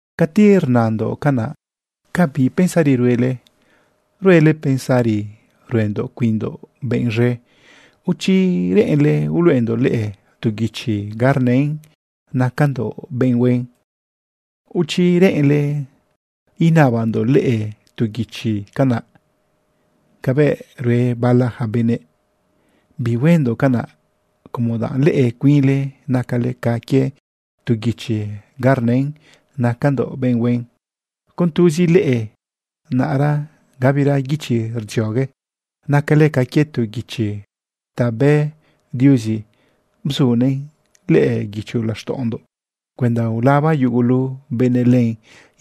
Cati rnandoꞌcanaꞌ ¿ca bi pensari ruele? ¿Ruele pensari ruendoꞌ cuinndoꞌ benꞌ z̃e? ¿O chi reꞌenle uluꞌendoꞌ leꞌe tu guichi ga rnën nacandoꞌ benꞌ huen? ¿O chi reꞌenle inabandoꞌ leꞌe tu guichi canaꞌ cabëꞌ rue bala ja benëꞌ? Bihuendoꞌ canaꞌ, como danꞌ leꞌe cuinle nacale ca quie tu guichi ga rnën nacandoꞌ benꞌ huen. Con tuzi leꞌe, naꞌra gabira guichi rdziogue. Nacale ca quie tu guichi ta bë Diuzi bzunëꞌn lëꞌë guicho laxtaꞌondoꞌ cuenda ulaba yugulu benëꞌ len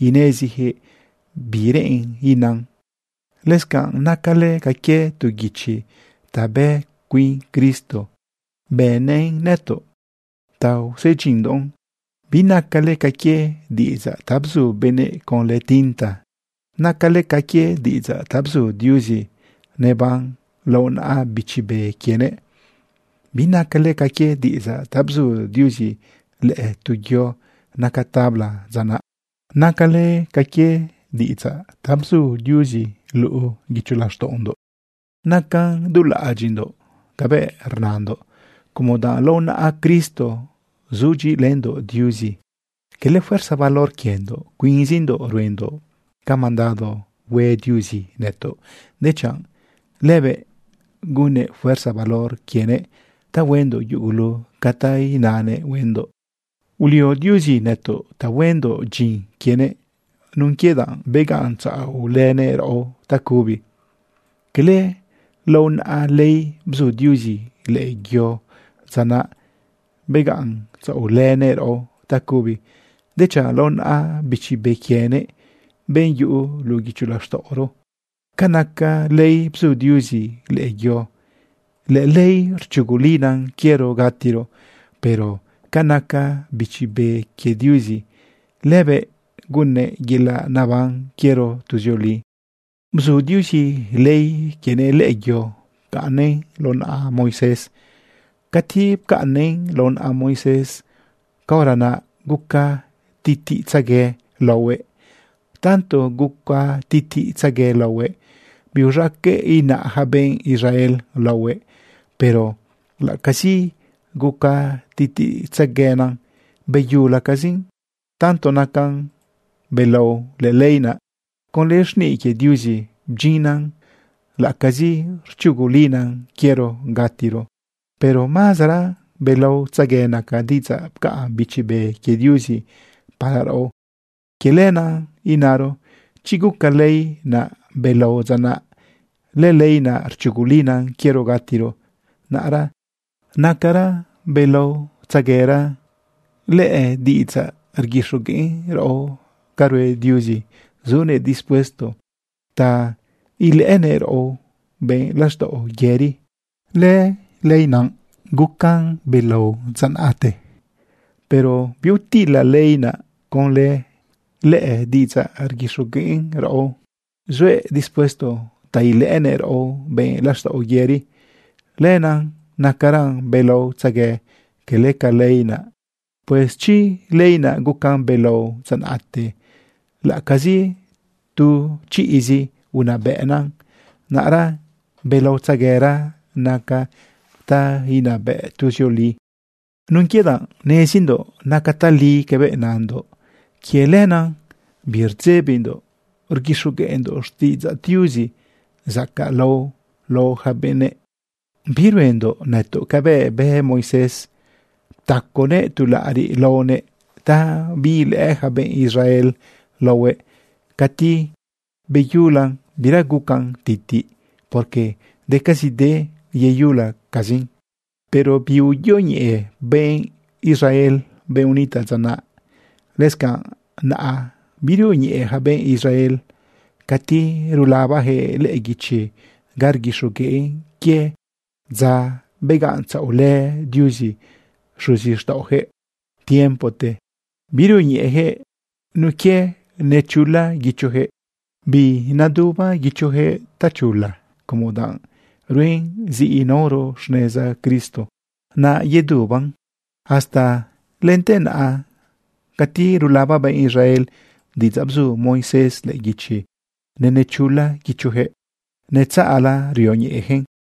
inezijëꞌ bi reꞌen inan. Lëscanꞌ nacale ca quie tu guichi ta bë cuin Cristo bënnëꞌ nëtoꞌ ta usedyinndoꞌn. Binacale ca quie diꞌidzaꞌ ta bzu benëꞌ conlë tinta. Nacale ca quie diꞌidzaꞌ ta bzu Diuzi neban lao naꞌa Bichi Be quienëꞌ. Binacale ca quie diꞌidzaꞌ ta bzu Diuzi lëꞌë tu yo naca tabla dza naꞌ. Nacale ca quie diꞌidzaꞌ ta bzu Diuzi lëꞌë guicho laxtaꞌondoꞌ. Nacan dulaꞌadyiꞌndoꞌ cabëꞌ rnandoꞌ como danꞌ lao naꞌa Cristo sudyiꞌilëndoꞌ Diuzi. Quele fuerza valor quiendoꞌ cuinzindoꞌ ruendoꞌ ca mandado hue Diuzi nëtoꞌ, dechanꞌ lëbëꞌ gunnëꞌ fuerza valor quienëꞌ ta huendoꞌ yugulu ca ta inanëꞌ huendoꞌ. Ulio Diuzi nëto ꞌ ta huendoꞌ dyin quienëꞌ nun quie danꞌ begaꞌntzaꞌolënëꞌ raꞌo tacubi. Cala lao naꞌa ley bzu Diuzi lëꞌë yo dza naꞌ begaꞌntzaꞌolënëꞌ raꞌo tacubi, dechanꞌ lao naꞌa Bichi Be quienëꞌ, benꞌ yuꞌu luꞌu guicho laxtaꞌoro. Ca naca ley bzu Diuzi lëꞌë yo, lëley rchugulina quiero gatiro. Pero ca naca Bichi Be quie Diuzi, lëbëꞌ gunnëꞌ yelaꞌ neban quiero tuzioli. Bzu Diuzi ley quienëꞌ lëꞌë yo pcaꞌnnëꞌn lao naꞌa Moisés. Cati pcaꞌnnëꞌn lao naꞌa Moisés, caora naꞌ guca titiꞌtzegue laohuëꞌ. Tanto guca titiꞌtzegue laohuëꞌ, biuz̃aqueꞌ inaꞌ yaca benꞌ Israel laohuëꞌ. Pero laꞌacazi guca titiꞌtzeguena, beyulacazin. Tanto nacan belao lëley naꞌ, conlë xniꞌ quie Diuzi bdyinnan, laꞌacazi rchugulina quiero gatiro, pero mazara belaotzegue naca diꞌidzaꞌ pcaꞌn Bichi Be quie Diuzi para raꞌo. Quie lenaꞌ inaro: Chi guca ley naꞌ belao dza naꞌ, lëley naꞌ rchugulina quiero gatiro, naꞌra nacara belaotzeguera lëdiꞌidzaꞌ rguixogueꞌn raꞌo ca rue Diuzi zunëꞌ dispuesto ta ilëꞌënëꞌ raꞌo benꞌ laxtaꞌo yëri. Lëley naꞌ gucan belao dza naꞌte, pero biutila ley naꞌ conlë lëdiꞌidzaꞌ rguixogueꞌn raꞌo zuëꞌ dispuesto ta ilëꞌënëꞌ raꞌo benꞌ laxtaꞌo yëri. Lenaꞌ nacaran belaotzegue quele ca ley naꞌ. Pues chi lëley naꞌ gucan belao dza naꞌte, laꞌacazi tu chiꞌzi unabëꞌna, naꞌra belaotzeguera naca ta inabëꞌ tuzioli. Nun quie danꞌ nezindoꞌ nacan tali cabëꞌ nandoꞌ, quie lenaꞌ birdzebindoꞌ rguixogueꞌndoꞌ xtiꞌidzaꞌ Diuzi zacaꞌlao lao ja benëꞌ. Biruendoꞌ nëtoꞌ cabëꞌ bë Moisés. Ptaconëꞌ tu laꞌariꞌ laonëꞌ ta biilëꞌë ja benꞌ Israel laohuëꞌ cati beyulan bira guca titiꞌn, porque decazide yeyulacazin. Pero biuyoñeꞌe benꞌ Israel, benꞌ unitaꞌ dza naꞌ. Lëscanꞌ naꞌa birioñeꞌe ja benꞌ Israel cati rulabajëꞌ lëꞌë guichi ga rguixogueꞌn quie dza begaꞌntzaꞌolë Diuzi xuzixtaꞌojëꞌ tiempote. Birioñeꞌejëꞌ nun quie nechula guichojëꞌ. Bineduba guichojëꞌ tachula, como danꞌ ruen zi inaoro xneza Cristo, naꞌ yeduban. Hasta lente naꞌa, cati rulaba benꞌ Israel diꞌidzaꞌ bzu Moisés lëꞌë guichi, nenechula guichojëꞌ netzaꞌla rioñeꞌejëꞌn.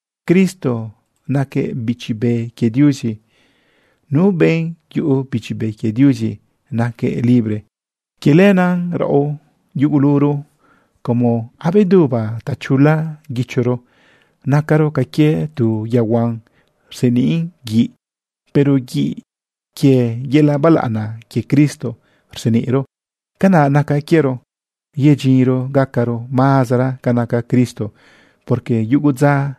Cristo naquëꞌ Bichi Be quie Diuzi. Nu benꞌ yuꞌu Bichi Be quie Diuzi naquëꞌ libre. Quie lenaꞌ raꞌo yuguluro, como abeduba tachula guichoro, nacaro ca quie tu yaohuan rseniꞌn guiꞌ, pero guiꞌ quie yelaꞌ balaꞌana quie Cristo rseniꞌro. Canaꞌ naca quiero yedyinro gacaro mazara ca naca Cristo, porque yugu dza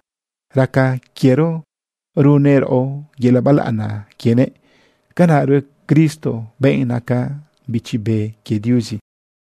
raca quiero runnëꞌ raꞌo yelaꞌ balaꞌana quienëꞌ. Canaꞌ rue Cristo, benꞌ naca Bichi Be quie Diuzi.